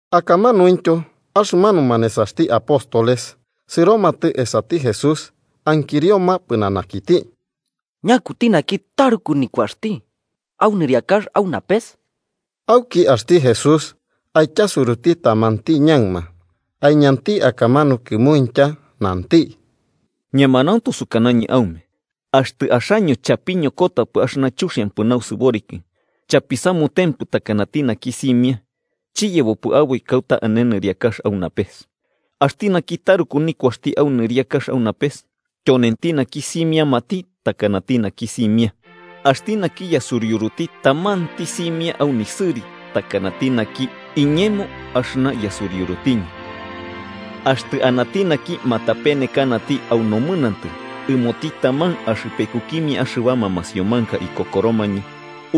Akamanuintyo axɨmanuma nesaxti apóstoles sɨromatɨ esati Jesús ankirioma pɨnanakiti: –¿Ñakuti naki taruku nikuaxti au nɨriakax au napes? Auki axti Jesús aityasuruti tamanti ñaɨma, aiñanti akamanu kɨmuintya nanti: –Ñemanauntu sukanañɨ aume axtɨ axaño chapiñokotapɨ axɨna chuxiampɨ nausɨboriki chapisamutempɨ takanati naki simia, chiyebopɨ aboi kauta ane nɨriakax au napes. Axti naki taruku nikuaxti au nɨriakax au napes tyonenti naki simiamati takanati naki simia. Axti naki yasuriuruti tamanti simia au nisɨri takanati naki, iñemo axɨna yasuriurutiñɨ. “Axtɨ anati naki matapenekanati au nomɨnantɨ ɨmoti taman axɨpekukimia axɨbama masiomanka ikokoromañɨ,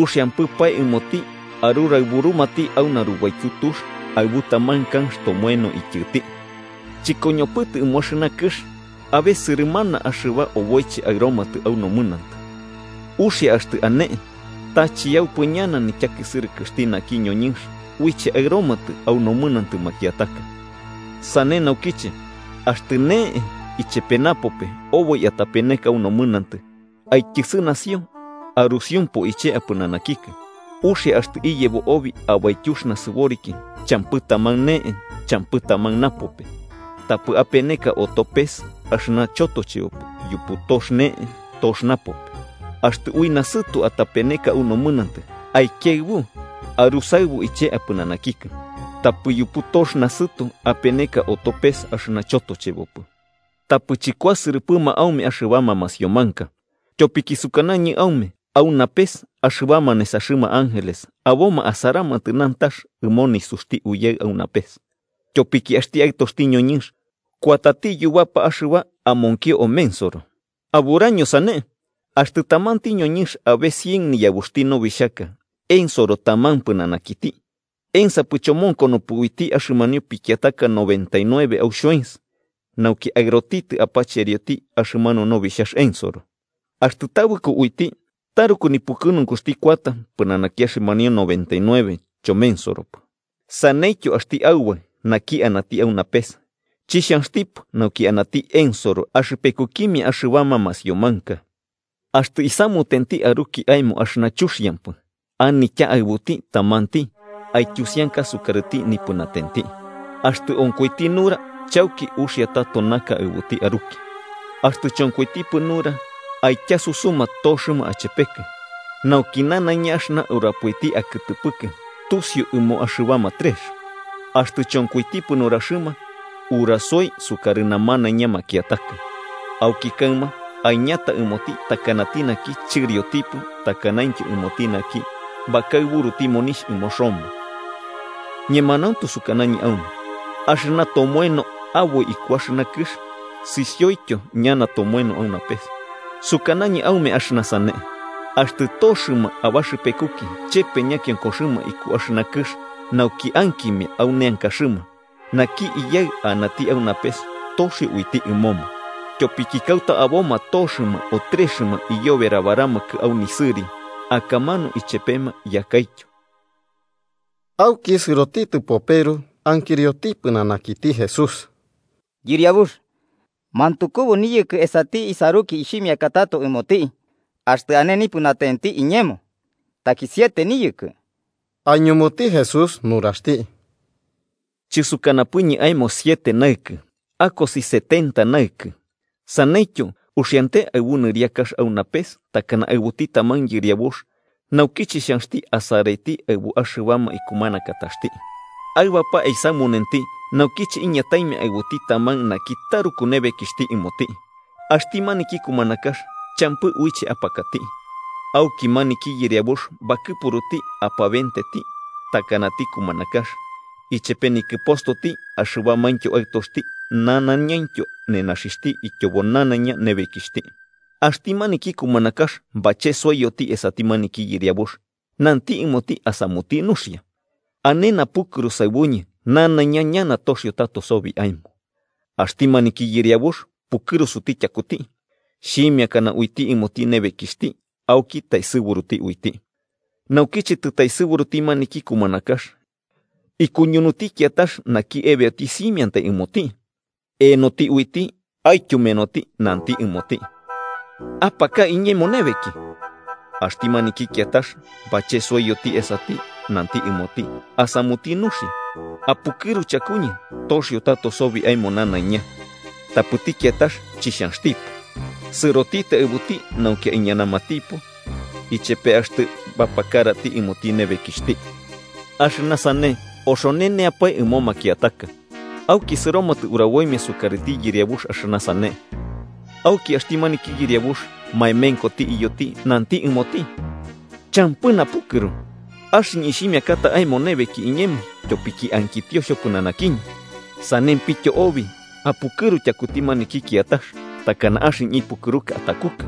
uxiampɨpae ɨmoti aruraɨburumati u narubaityu tux aɨbu taman kanx tomoeno ityɨti. ¡Chɨkoñopɨtɨ ɨmo axɨna kɨx abe sɨrɨmana axɨba oboiche aɨromatɨ au nomɨnantɨ! Uxia axtɨ ane, ta ¡chiyaupɨ ñana nityakisɨrɨkɨxti naki ñoñɨnx uiche aɨromatɨ au nomɨnantɨ makiataka! “Sane naukiche, axtɨ ne'e ichepe napope oboi atapeneka au nomɨnantɨ, aityɨsɨnasio arusiumpu iche apɨnanakikɨ. Uxia axtɨ iyebo obi abaityux nasɨboriki champɨ taman ne'e champɨ taman napope, tapɨ apeneka oto pes axɨna chotochebopɨ yupu tox ne'e tox napope. Axtɨ ui nasɨto atapeneka au nomɨnantɨ, aikiaɨbu arusaɨbu iche apɨnanakikɨ. Tapɨ yupu tox nasɨto apeneka oto pes axɨna chotochebopɨ. “Tapɨ chɨkuasɨrɨpɨma aume axɨbama masiomanka. Tyopiki sukanañɨ aume au napes axɨbama nesaxɨma ángeles aboma asaramatɨ nantax ɨmo nisuxti Iyaɨ au napes. Tyopiki axti Aɨtoxti ñoñɨnx kuatati yubapa axɨba amonkio omensoro. “¿Aburaño sane? Axtɨ tamanti ñoñɨnx abe cien niyabuxti nobixhaka ensoro taman pɨnanakiti, ¿ensapɨ chomonkonopɨ uiti axɨmanio pikiataka noventa y nueve au xhoens, nauki aɨrotitɨ apacherioti axɨmanu nobixhax ensoro? Axtɨ tabɨko uiti, taruku nipukɨnunkuxti kuata pɨnanaki axɨmanio noventa y nueve chomensoropɨ. Saneityo, axti Aubaɨ naki anati au napes, chixhanxtipɨ nauki anati ensoro axɨpekukimia axɨbama masiomanka. “Axtɨ isamutenti aruki aemo axɨna chuxiampɨ, anitya aɨbuti tamanti aityusianka sukarɨti nipɨnatenti. Axtɨ onkoiti nura chauki uxia tato naka aɨbuti aruki. Axtɨ chonkoitipɨ nura, aityasusuma toxɨma achepekɨ, nauki nanaiña axɨna urapoiti akɨtɨpɨkɨ tusiu ɨmo axɨbama trex. Axtɨ chonkoitipɨ nuraxɨma, urasoi sukarɨ namanaiña makiataka, auki kaɨma aiñata ɨmoti takanati naki chɨriotipɨ takanaintyo ɨmoti naki bakaɨburuti monixh ɨmo Roma. “Ñemanauntu sukanañɨ aume axɨna tomoeno aboi iku axɨna kɨx sisioityo ñana tomoeno au napes. “Sukanañɨ aume axɨna sane: Axtɨ toxɨma abaxɨpekuki chepe ñakionkoxɨma iku axɨna kɨx nauki ankimia au neankaxɨma, naki Iyaɨ anati au napes toxio uiti ɨmoma. Tyopiki kauta aboma toxɨma o trexɨma iyoberabaramakɨ au nisɨri, akamanu ichepema yakaityo. Auki sɨrotitɨ Peru ankirioti pɨnanakiti Jesús: –Yɨriabux, ¿mantukubu niyɨkɨ esati isaruki ixhimiaka tato ɨmoti, axtɨ ane nipɨnatenti iñemo? ¿Taki siete niyɨkɨ? Aiñumuti Jesús nuraxti: –Chɨsukanapɨñɨ aemo siete naɨkɨ, akosi setenta naɨkɨ. “Saneityo, uxiante aɨbu nɨriakax au napes takana aɨbuti taman yɨriabux naukiche xhanxti asaraiti aɨbu axɨbama ikumanakataxti. Aɨbapae aisamunenti naukiche iñataimia aɨbuti taman naki taruku nebekixhti ɨmoti. Axti maniki kumanakax champɨ uiche apakati, auki maniki yɨriabux bakɨpuruti apabenteti takanati kumanakax, ichepe nikɨpostoti, axɨbamaintyo aɨtoxti nanaiñaintyo nenaxixhti, ityobo nanaiña nebekixhti. Axti maniki kumanakax bachesoiyoti esati maniki yɨriabux, nanti ɨmoti asamuti nuxia: ‘Ane napukɨru saɨbuñɨ nanaiña ñana toxio tato sobi aemo.’ Axti maniki yɨriabux pukɨrusuti tyakuti. Xhimiakana uiti ɨmoti nebekixhti auki taesɨburuti uiti. “Naukiche tɨtaesɨburuti maniki kumanakax, ikuñunuti kiatax naki ebeoti simiantai ɨmoti. Eenoti uiti aityumenoti, nanti ɨmoti: ‘¡Apaka iñemo nebeki!’ Axti maniki kiatax, bachesoiyoti esati, nanti ɨmoti asamuti nuxia: ‘Apukɨru chakuñɨ toxio tato sobi aemo nanaiña.’ Tapɨti kiatax chixhanxtipɨ, sɨrotitɨ aɨbuti nauki aiñamanatipo ichepe axtɨ bapakarati ɨmoti nebekixhti. Axɨna sane oxoneneapae ɨmo makiataka, auki sɨromatɨ uraboimia sukarɨti yɨriabux axɨna sane. Auki axti maniki yɨriabux maemenkoti iyoti, nanti ɨmoti: ‘¡Champɨ napukɨru! Axɨñɨ ixhimiakata aemo nebeki iñemo tyopiki ankitio xhopɨnanakiñɨ. Sanempityo obi apukɨru tyakuti maniki kiatax, takana axɨñɨ ipukɨruka atakukɨ.’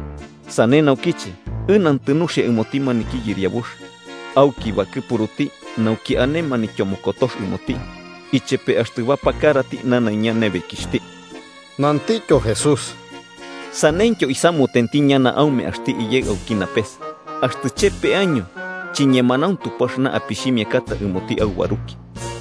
Sane naukiche ɨnantɨ nuxia ɨmoti maniki yɨriabux, auki bakɨpuruti nauki ane manityomokotox ɨmoti ichepe axtɨ bapakarati nanaiña nebekixhti.” Nantityo Jesús: –Sanentyo isamutenti ñana aume axti Iyaɨ auki napes, axtɨ chepe año chiñemanauntupɨ axɨna apixhimiakata ɨmoti aubaruki.